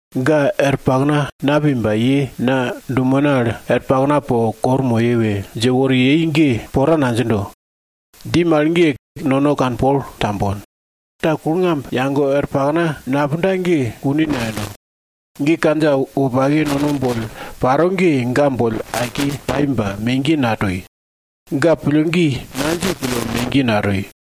Ga er pakna napi ba ye na dumena al er pakna po waka moye we dje wori yei ge, pora nadjindo. Dji mal ge, nono kanpol tambon. Ta kulngamb yage er pakna napunda ge kune nayendo. Ge kandja wopake nono boll paro ge, ga boll aike pai ba megiye natoi. Ga pillgi nadji pille megiye natoi.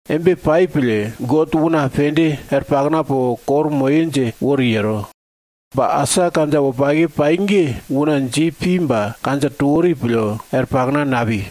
Embe pai pille, God una pende er pakna po waka moye dje wori yero. Ba, asa, kandja wopake pai ge, una dji pi ba kandja to wori pille er pakna napi.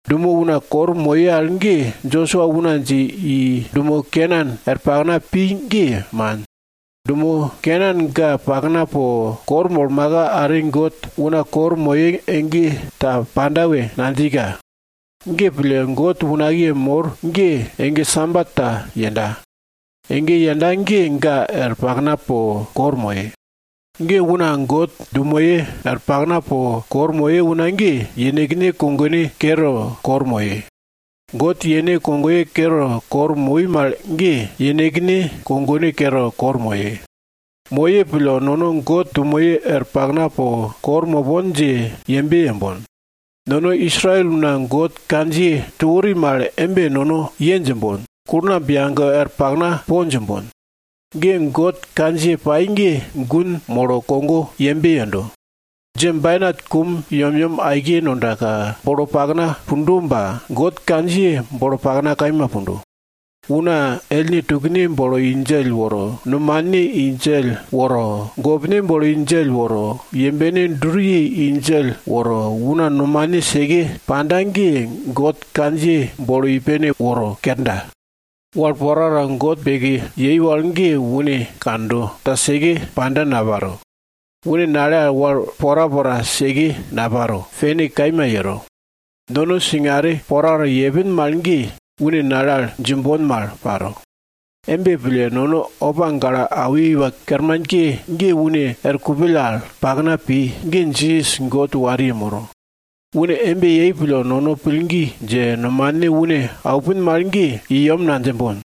Dumo una waka moye al ge, Josua una dje i dumo Kenan er pakna pi ge man. Dumo Kenan ga pakna po waka molmaka are God una waka moye ege ta panda we nadjika. Ge pille, God unakiye mor ge, ege Sabat ta yenda. Ege yenda ge, ga er pakna po waka moye. Una God dumoye er pakna po waka moye una ge, yenekne kogone kere waka moye. God yene kogoye kere waka moi mal ge, yenekne kogone kere waka moye. Moye pille, nono God dumoye er pakna po waka mopon dje yembe yembon. Nono Israel una God kandjiye to wori mal embe nono ye djimbon, kulngamb yage er pakna po djimbon. God kandjiye pai ge gun molo kogo yembe yendo. Djebainat kum yemyem aike nondaka, bolo pakna pundo ba, God kandjiye bolo pakna kaima pundo. Una ellne tukne bolo i djell woro, nomane i djell woro, gopne bolo i djell woro, yembe duriye i djell woro, una nomane seke panda ge God kandjiye bolo i pene woro kerda. Wal porapora God beke yei wal ge une kando, ta seke panda naparo. Une nale al wal porapora seke naparo, pene kaima yero. Nono singare porapora yepin mal ge, une nale al djimbon mal paro. Embe pille, nono opa gale awi iwa kermanke ge une er kupill al pakna pi, ge Jisas God wariye moro. Une embe yei pille, nono pillgi dje, nomane une aupin mal ge, i yem nadjimbon.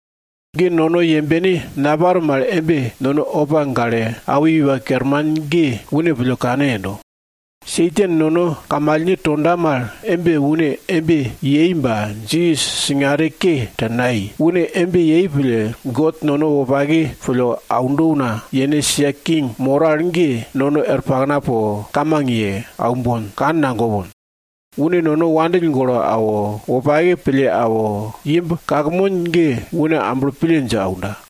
Nono yembene naparo mal embe nono opa gale awi iwa kerman ge une pille kane yendo. Satan nono kamalne tondo mal embe une embe toi ba Jisas singare ke ta nayei. Une embe yei pille, God nono wopake pille aundo una yene sia king moro al ge, nono er pakna po kamang ye aumbon, kand nagopon. Une nono wandill golo awo, wopake pille awo, imb kakmon ge une amblo pille dje aunda.